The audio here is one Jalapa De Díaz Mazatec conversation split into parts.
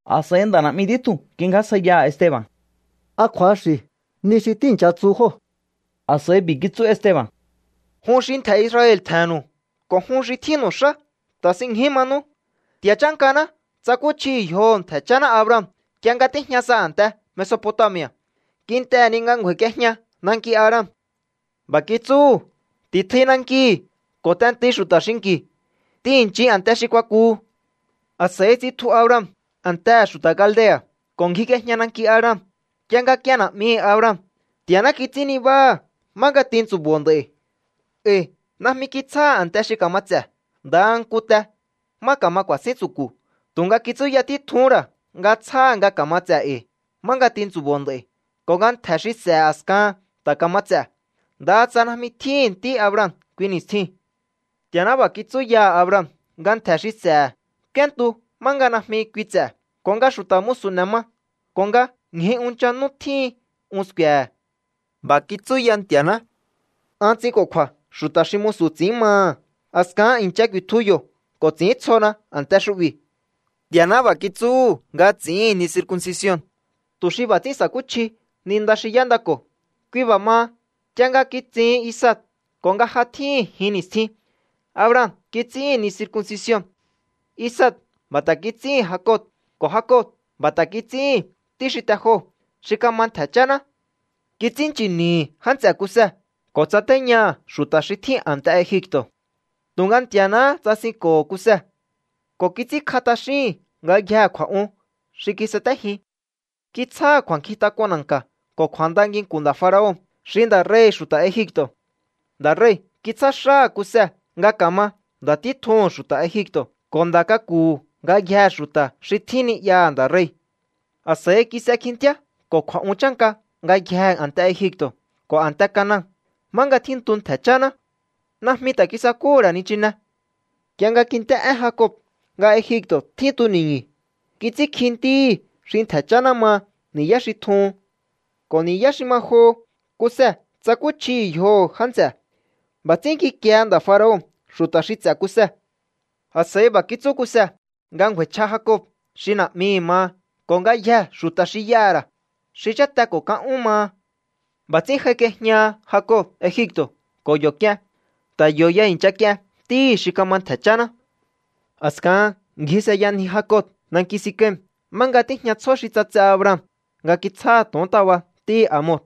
A̱s'a̱i nda̱ na̱'mi títjuu̱n kingjásjaiyaha̱ Esteba̱n: —¿A kju̱axi̱ ni xi tíi̱ncha tsu jóo̱? A̱s'a̱i b'i̱ kitsú Esteba̱n: —Jun xi ntje̱ Israel tje̱he̱nnu̱u ko̱ jun xi tjínnu̱u xá, ta̱sinñju manú. Nti̱a̱ chánkaná tsakúchjihi̱ yjoho̱ ntje̱ cháná Abraham nk'ie nga tíjña sa a̱nte Mesopotami̱a̱, kintehe̱ ni nga ngju̱a̱i̱k'iejña nanki Haran. B'a̱ kitsúhu̱: “Ti̱tjui nankihi̱ ko̱ t'entui xu̱ta̱ xinki̱. T'ihi̱nnchin a̱nte xi kuakuhu.” A̱s'a̱i tsitju Abraham a̱ntehe̱ xu̱ta̱ Caldea̱ ko̱ ngjik'iejña nanki Haran. Nk'ie nga k'ien na̱'mihi̱ Abraham, Nti̱a̱ná kits'ín nibáha̱ má tintsu̱bo̱o nd'a̱i̱. ’E̱i̱ najmi kitsjáha̱ a̱nte xi ka̱ma ts'e̱, ndaha nku te má ka̱ma ku̱a̱sín tsu̱ku̱. Tu̱nga kitsúya títjuhún ra̱ nga tsjáha̱ nga ka̱ma ts'e̱ e̱i̱ má tintsu̱bo̱o nd'a̱i̱ ko̱ nga ntje̱ xi s'e̱he̱ a̱skahan ta̱ ka̱ma ts'e̱, ndaha tsa najmi tjíhi̱n ntí Abraham kui ni̱stjiu̱n. Nti̱a̱ná b'a̱ kitsú yaha̱ Abraham nga ntje̱ xi s'e̱he̱ k'úéntu má nga najmi kui ts'e̱, ko̱ nga xu̱ta̱ musu̱ n'e̱ ma, ko̱ nga ñju unchan nú tjíhin un sku̱e̱he̱. B'a̱ kitsú ya Nti̱a̱ná: “An ts'inko̱kju̱a̱ xu̱ta̱ xi musu̱ ts'i̱ín maha̱. A̱skahan i̱ncha ku̱i̱tju yo̱ ko̱ ts'i̱íntsjona a̱nte xu'bi̱.” ’Nti̱a̱ná b'a̱ kitsúhu̱ nga ts'i̱ín ni circuncision, tu̱ xi b'a̱ ts'ín sa̱kúchji ni nda xi y'éndako̱. Kui b'a̱ maha, nk'ie nga kitsihin Isaac ko̱ nga ja tjíhi̱n jin ni̱stjin, Abraham kits'íhi̱n ni circuncision. Isaac b'a̱ ta̱ kits'íhi̱n Jacob, ko̱ Jacob b'a̱ ta̱ kits'íhi̱n ntí xi te joho̱, xi kama ntje̱ cháná. ’Kits'ínnchi̱ni̱hi̱ já nts'e̱ Kuse ko̱ tsatéñaha̱ xu̱ta̱ xí tjín a̱nte Egipto̱. Tu̱nga Nti̱a̱náhá tsasinko̱ho̱ Kuse ko̱ kits'ínkj'a t'axíhi̱n ngayjee̱ kju̱a̱'un xi kisatéjin. Kitsjáha̱ kju̱a̱nkjintak'un na̱nka̱ ko̱ kju̱a̱nda nginku̱n nda̱ faraon, xi nda̱ rei̱hi̱ xu̱ta̱ Egipto̱. Nda̱ rei̱ kitsjá xáha̱ Kuse nga ka̱ma nda̱ títjuhu̱n xu̱ta̱ Egipto̱ ko̱ nda̱ k'aku̱hu̱ ngayjee̱ xu̱ta̱ xi tjín ni'yaha̱ nda̱ rei̱. ’A̱s'a̱i kis'e kjintíá ko̱ kju̱a̱'un chánka ngayjee̱ a̱nte Egipto̱ ko̱ a̱nte Canaan, má nga tjíntu ntje̱ cháná. Najmi ta̱ kisakúhu̱ ra̱ nichine. Nk'ie nga kint'é én Jacob nga Egipto̱ tjín tuni̱ñu̱, kits'ínkji ntíhi̱ xi ntje̱ cháná maha ni̱yá xi tjuhun. Ko̱ ni̱yá xi ma joho Kuse tsakúchjihi̱ yjoho̱ já nts'e̱. B'a̱ ts'ín kikiehe nda̱ faraon xu̱ta̱ xi ts'e̱ Kuse. ’A̱s'a̱i b'a̱ kitsú Kuse nga ngju̱a̱i̱chj'a Jacob xi na̱'mihi̱ maha ko̱ ngayjee̱ xu̱ta̱ xi y'aha̱ ra̱, xi cháte ko̱ kan ún maha. B'a̱ ts'ín j'aik'iejñaha Jacob Egipto̱ ko̱ yo̱ k'ien. Ta̱ yo̱ ya i̱ncha k'ien ntíhi̱ xi kama ntje̱ cháná. A̱skahan ngji s'eyanji Jacob nanki Sikem, má nga tíjña tsjó xi ts'atse Abraham nga kitsjáha̱ to̱ontaba ntíhi̱ Hamor.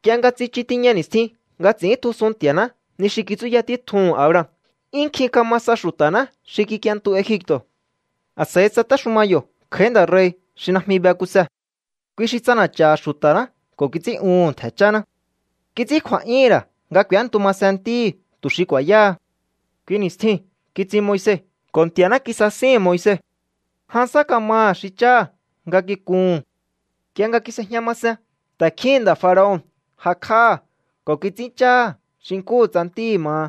’Nk'ie nga tsichu tiña ni̱stjin nga ts'i̱íntjusun Nti̱a̱ná ni xi kitsúya títjuhu̱n Abraham, 'yún nkjin kama sa xu̱ta̱ná xi kik'ientu Egipto̱. A̱s'a̱i tsatéxuma yo̱ kj'a̱í nda̱ rei̱ xi najmi be Kuse. Kui xi ts'ana̱cha̱ha̱ xu̱ta̱ná ko̱ kits'ín'uhu̱n ntje̱ cháná. Kits'ín kju̱a̱'yúhu̱n ra̱ nga k'u̱éntu masen ntíhi̱ tu̱ xi ku̱a̱yáha. ’Kui ni̱stjiu̱n kitsin Moise ko̱ Nti̱a̱ná kisasíhi̱n Moise. Jan sá kamaha̱ xi cháha̱ nga kikuhu̱n. Nk'ie nga kis'ejña masen, ta̱kjíhi̱n nda̱ faraon jakj'áha̱ ko̱ kits'íncháha̱ xi nkúhu tsa ntíhi̱ maha.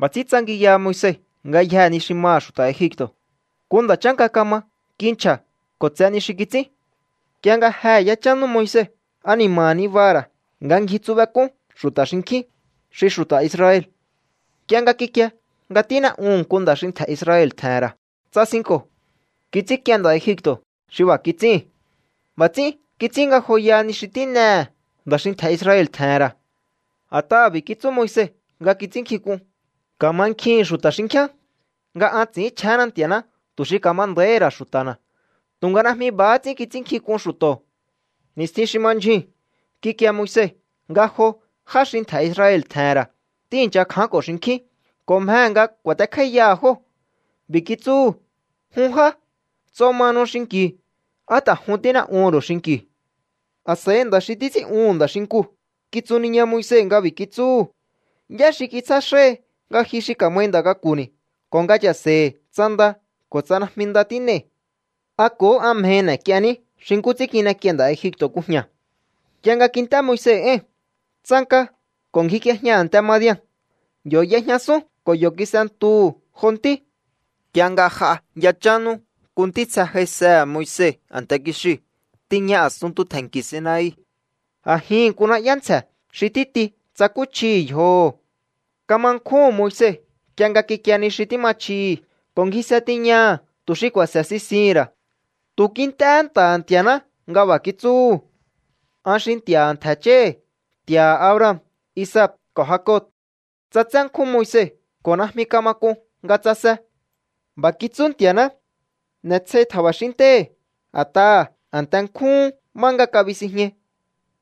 B'a̱ ts'ín tsangiyaha Moise ngayjee̱ ni xi maha̱ xu̱ta̱ Egipto̱. Nku nda̱ chánka kama. Kinchja̱ ko̱ tse ni xi kits'ín. ’Nk'ie nga jehe̱ yachán nú Moise, ani̱ma̱ha̱ nibaha̱ ra̱ nga ngjitsubek'ún xu̱ta̱ xinkjín, xi xu̱ta̱ Israel. Nk'ie nga kikie nga tín'e'uhu̱n nku nda̱ xi ntje̱ Israel tje̱he̱n ra̱, tsasinko̱. Kits'ínk'ien nda̱ Egipto̱ xi b'a̱ kits'íhi̱n. B'a̱ ts'ín kits'ín ngajoyaha ni xi tín'ehe̱ nda̱ xi ntje̱ Israel tje̱he̱n ra̱. A̱t'aha̱ b'i̱ kitsú Moise nga kits'ínnkjink'un: “Ka̱mankjihi̱n xu̱ta̱ xinkjíán nga an ts'i̱ínchjénna Nti̱a̱ná tu̱ xi ka̱ma nda̱íhi̱ ra̱ xu̱ta̱na̱.” Tu̱nga najmi b'a̱há ts'ín kits'ínnkjink'un xu̱to̱. ’Ni̱stjin xi ma ndyjuu̱n kikie Moise nga jo já xi ntje̱ Israel tje̱he̱n ra̱ tíi̱ncha kjánko̱ xinkjín ko̱ mjehe̱ nga ku̱a̱tekj'áíyaha̱ jóo̱. B'i̱ kitsúhu̱: “Jun já, nts'o mahanu xinki̱u. ¿Á ta̱ jun tín'e'uhu̱n ru̱u xinki̱u?” A̱s'a̱i nda̱ xi títs'ín'uhu̱n nda̱ xinkuu̱ kitsuniña Moise nga b'a̱ kitsúhu̱: “¿Yá xi kitsjá xáhi nga ji xi ka̱mai nda̱ k'aku̱ni̱ ko̱ nga cha̱se̱i̱hi̱ tsa nda ko̱ tsa najmi nda tín'ei̱? ¿A ko̱hó an mjehi n'e̱k'ienní xi nkú ts'ín kin'ek'iein nda̱ Egipto̱ kujña̱?” Nk'ie nga kint'é Moise éi̱n, tsanka ko̱ ngjik'iejña a̱nte Madian. Yo̱ y'ejñasún ko̱ yo̱ kis'entuhu̱ jo ntí. ’Nk'ie nga j'a yachán nú, nku ntítsje j'aisehe̱ Moise a̱nte kixiu̱ tiña a̱sunntu tje̱nki̱ Sinai. A̱jihi̱n nku na̱'yá ntsje̱ xi títi tsakúchjihi̱ yjoho̱. Kama nkjúhu̱n Moise nk'ie nga kikie ni xi tíma chjihi̱ ko̱ ngjise tiñaha̱ tu̱ xi ku̱a̱se̱ sisihi̱n ra̱. Tu̱ kint'éhé nta̱ha̱ Nti̱a̱ná nga b'a̱ kitsúhu̱: “An xi Nti̱a̱ha̱ ntje̱ cháhi̱, Nti̱a̱ha̱ Abraham, Isaac ko̱ Jacob.” Ts'atsé nkjún Moise ko̱ najmi kama k'un nga tsase. B'a̱ kitsú Nti̱a̱ná: “N'e̱sjei tja̱ba̱xín ntéhi̱, a̱t'aha̱ a̱nte nkjúhún má nga kabisinjñai.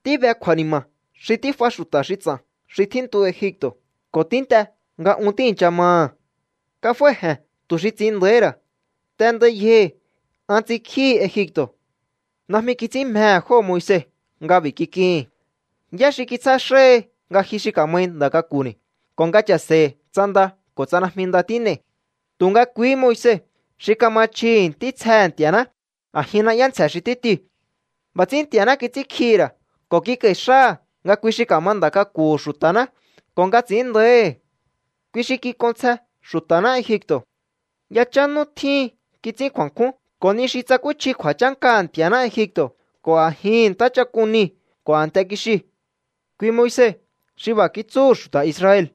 Tíbe kju̱a̱ni̱ma̱ xi tíf'a xu̱ta̱ xi ts'a̱n xi tjíntu Egipto̱ ko̱ tínt'e nga un tíi̱ncha maha̱. Kaf'ái̱je̱n tu̱ xi ts'in nda̱íhi̱ ra̱. T'endai yjohi̱. An ts'inkjíhi Egipto̱.” ’Najmi kits'ín mjehe̱ jóo̱ Moise nga b'i̱ kik'ihi̱n: “¿Yá xi kitsjá xáhi nga ji xi ka̱mai nda̱ k'aku̱ni̱ ko̱ nga cha̱se̱i̱hi̱ tsa nda ko̱ tsa najmi nda tín'ei̱?” Tu̱nga kuihí Moise xi kama chjihi̱ ntítsjehe̱ Nti̱a̱ná a̱jin na'yá ntsje̱ xi títiu̱. B'a̱ ts'ín Nti̱a̱ná kits'ínkjihi̱ ra̱ ko̱ kik'a̱i̱ xáha̱ nga kui xi kama nda̱ k'aku̱hu̱ xu̱ta̱ná ko̱ nga ts'i̱ín nda̱íhi̱. Kui xi kik'onsje xu̱ta̱ná Egipto̱. Yachán nú tjíhin kits'ín kju̱a̱nkjún ko̱ ni xi tsakúchji kju̱a̱chánkaha̱ Nti̱a̱ná Egipto̱ ko̱ a̱jihi̱n Ntáchak'un Niu̱ ko̱ a̱nte kixiu̱. ’Kui Moise xi b'a̱ kitsúhu̱ xu̱ta̱ Israel: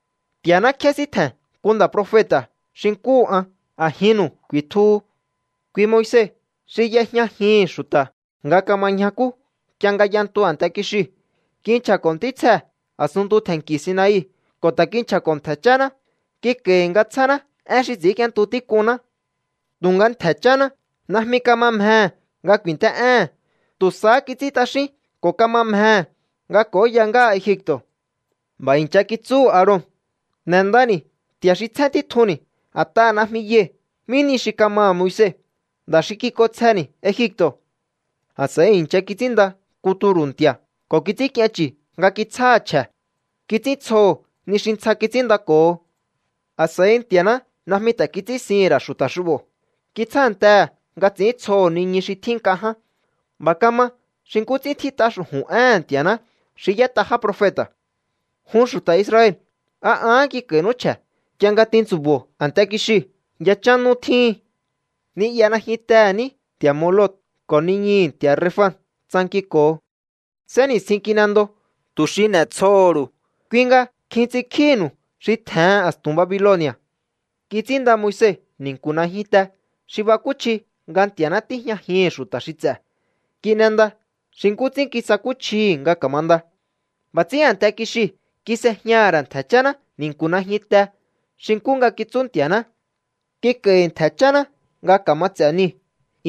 “Nti̱a̱ná kjésíntje̱n nku nda̱ profeta̱ xi nkúhu an. A̱jinnu̱u ku̱i̱tjuhu.” Kui Moise xi y'ejñajihi̱n xu̱ta̱ nga kama ñjakú nk'ie nga y'entu a̱nte kixiu̱. Kinchja̱ko̱ ntítsjee̱ a̱sunntu tje̱nki̱ Sinai ko̱ ta̱ kinchja̱ko̱ ntje̱ cháná. Kik'a̱i̱hi̱ nga tsjáná én xi ts'ínk'íéntu tík'unná. ’Tu̱nga ntje̱ cháná najmi kama mjehe̱ nga ku̱i̱nt'é'éhe̱n. Tu̱ sahá kits'ín t'axín ko̱ kama mjehe̱ nga k'o̱óya ngáha Egipto̱. B'a̱ i̱ncha kitsúhu̱ Aaron: “N'e̱ndani̱ nti̱a̱ xi tsjén títjunni̱, a̱t'aha̱ najmi yai̱ mí nihi xi kamaha̱ Moise, nda̱ xi kik'onsjeni̱ Egipto̱.” A̱s'a̱i i̱ncha kits'ínnda nku turu̱ nti̱a̱ ko̱ kits'ínk'ien chu̱ nga kitsjáha̱ chje̱. Kits'íntsjoho̱ ni xi ntsja kits'ínndako̱ho. ’A̱s'a̱i Nti̱a̱ná najmi ta̱ kits'ínsihi̱n ra̱ xu̱ta̱ xu'bo̱. Kitsjántehe̱ nga ts'i̱íntsjoho̱ niñu xi tjín nk'a ján. B'a̱ kama xi nkú ts'ín tjít'a xu̱ju̱n éhe̱n Nti̱a̱ná xi y'ét'a já profeta̱: Jun xu̱ta̱ Israel, ¿a ahán kik'a̱i̱nú chje̱, nk'ie nga tintsu̱bo̱o a̱nte kixiu̱ yachán nú tjíhin? Ni'ya najyuntehe̱ ní nti̱a̱ Moloc ko̱ niñuhu̱ nti̱a̱ Renfan tsankinko̱o. Sénni̱stjin kin'endo tu̱ xi n'e̱tsjoho̱ru̱u, kui nga kjin ts'inkjíhi̱nu̱u xi tje̱hen a̱stu̱n Babiloni̱a̱. ’Kits'ínnda Moise ni̱nku̱ najyunte xi bakúchji nga Nti̱a̱ná tíjñajihi̱n xu̱ta̱ xi ts'e̱. Kin'enda xi nkú ts'ín kisakúchjihi̱ nga ka̱manda. B'a̱ ts'ín a̱nte kixiu̱ kis'ejñaha̱ ra̱ ntje̱ cháná ni̱nku̱ najyuntee̱ xi nkú nga kitsú Nti̱a̱ná. Kik'a̱i̱hi̱ ntje̱ cháná nga ka̱ma ts'e̱ niu̱.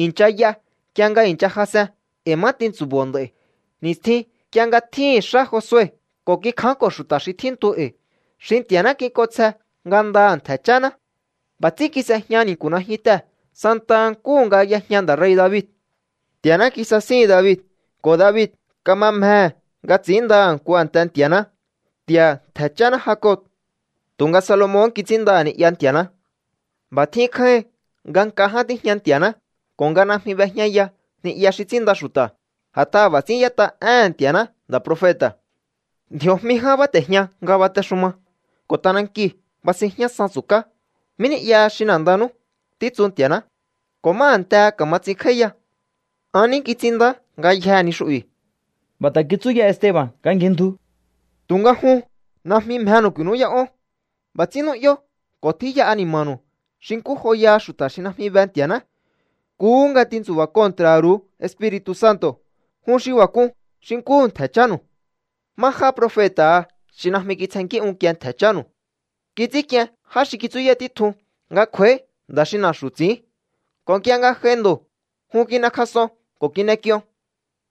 I̱ncha y'a nk'ie nga i̱ncha jas'en e̱i̱ má tintsu̱bo̱o nd'a̱i̱, ni̱stjin nk'ie nga tjíhi̱n xá Josue ko̱ kikjánko̱ xu̱ta̱ xi tjíntu e̱i̱, xi Nti̱a̱ná kik'onsje ngandaha̱ ntje̱ cháná. B'a̱ ts'ín kis'ejña ni̱nku̱ najyuntee̱ santaha nkúhu nga y'ejña nda̱ rei̱ David. ’Nti̱a̱ná kisasíhi̱n David ko̱ David kama mjehe̱ nga ts'i̱índaha̱ nku a̱nte Nti̱a̱ná, Nti̱a̱ha̱ ntje̱ cháná Jacob. Tu̱nga Salomon kits'ínndaha̱ ni'ya Nti̱a̱ná. B'a̱ tjín kjáíhin nga nk'a ján tíjña Nti̱a̱ná ko̱ nga najmi b'ejñaya ni'ya xi ts'ínnda xu̱ta̱. A̱t'aha̱ b'a̱ ts'ín y'ét'a éhe̱n Nti̱a̱ná nda̱ profeta̱: Ndji̱o̱jmi ján báte̱jña nga batexuma, ko̱ t'anankiu̱ basinjñásan tsu̱ká. ¿Mí ni'yaha xi n'e̱ndanú, títsu Nti̱a̱ná, ko̱ má a̱ntehe ka̱ma ts'inkj'áíya? An ní kits'inndá ngayjee̱ ni xu'bi̱. B'a̱ ta̱ kitsú ya Esteba̱n nga ngjindju: —Tu̱nga jun najmi mjenu̱u ku̱i̱nú'yá'ón. B'a̱ ts'ín nu'yó ko̱ tjíya ani̱ma̱nu̱u xi nkú joyaha xu̱ta̱ xi najmi be Nti̱a̱ná. Nkuhú nga tintsu̱ba̱ kontra̱ha̱ ru̱u Espiri̱tu̱ Santo̱. Jun xi b'a̱ k'un xi nkúhu ntje̱ chánu̱u. ¿Má já profeta̱ha xi najmi kitsjennkí unkie ntje̱ chánu̱u? Kits'ínk'ien já xi kitsúya títjun nga kj'u̱a̱í nda̱ xi na̱xu̱ ts'i̱ín. Ko̱ nk'ie nga j'ai ndo̱, jun kin'ekjas'on ko̱ kin'ek'ion.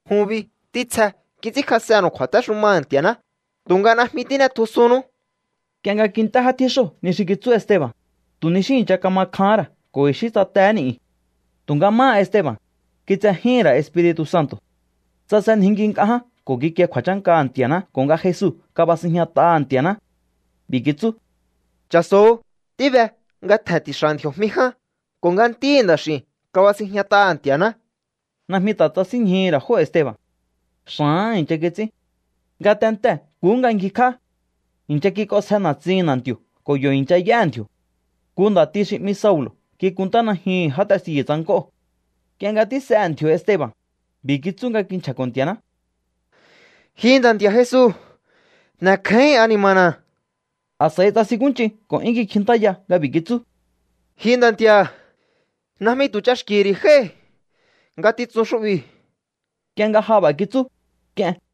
Jun bi ntítsje kits'ínkjas'ennu̱u kju̱a̱téxumaha̱ Nti̱a̱ná tu̱nga najmi tín'etjusunnú. Nk'ie nga kint'é já tjíxóo̱ ni xi kitsú Esteba̱n, tu̱ ni xí i̱ncha kama kjahán ra̱ ko̱ i̱xí tsatehé ni̱'yu̱n. Tu̱nga máha Esteba̱n, kitsejíhi̱n ra̱ Espiri̱tu̱ Santo̱. Tsasenjinki nk'a ján ko̱ kikie kju̱a̱chánkaha̱ Nti̱a̱ná ko̱ nga Jesu kabasinjñat'aha̱ Nti̱a̱ná. B'i̱ kitsú: —¡Cha̱so̱o! Tíbe nga tje̱n ti̱xa̱ ndji̱o̱jmi ján ko̱ nga Ntíhi̱ Nda̱x'i̱u̱n kabasinjñat'aha̱ Nti̱a̱ná. Najmi ta̱ tsasínñjuhu̱ ra̱ jóo̱ Esteba̱n. Xa̱áha̱n i̱ncha kits'ín. Ngatentee̱ nkuhú nga ngjikj'á. I̱ncha kik'onsje na̱tsihi̱n na̱nti̱o̱ ko̱ yo̱ i̱ncha y'éhe̱ ndji̱o̱. Nku nda̱ti xi 'mi Saulo̱ kikunntá najyuhu̱n já testiyu̱ tsank'óo̱. Nk'ie nga tís'ehe̱ ndji̱o̱ Esteba̱n, b'i̱ kitsú nga kinchja̱ko̱ Nti̱a̱ná: —Ji Nda̱ Nti̱a̱ Jesu, n'e̱kjáíhi̱n ani̱ma̱na̱. A̱s'a̱i tsasinkúnch'in ko̱ 'yún kikjintáya nga b'i̱ kitsú: —Ji Nda̱ Nti̱a̱, najmi tu̱ ch'axki̱hi̱ ri̱ jái̱ ngatitsun xu'bi̱. Nk'ie nga ja b'a̱ kitsú, k'ien.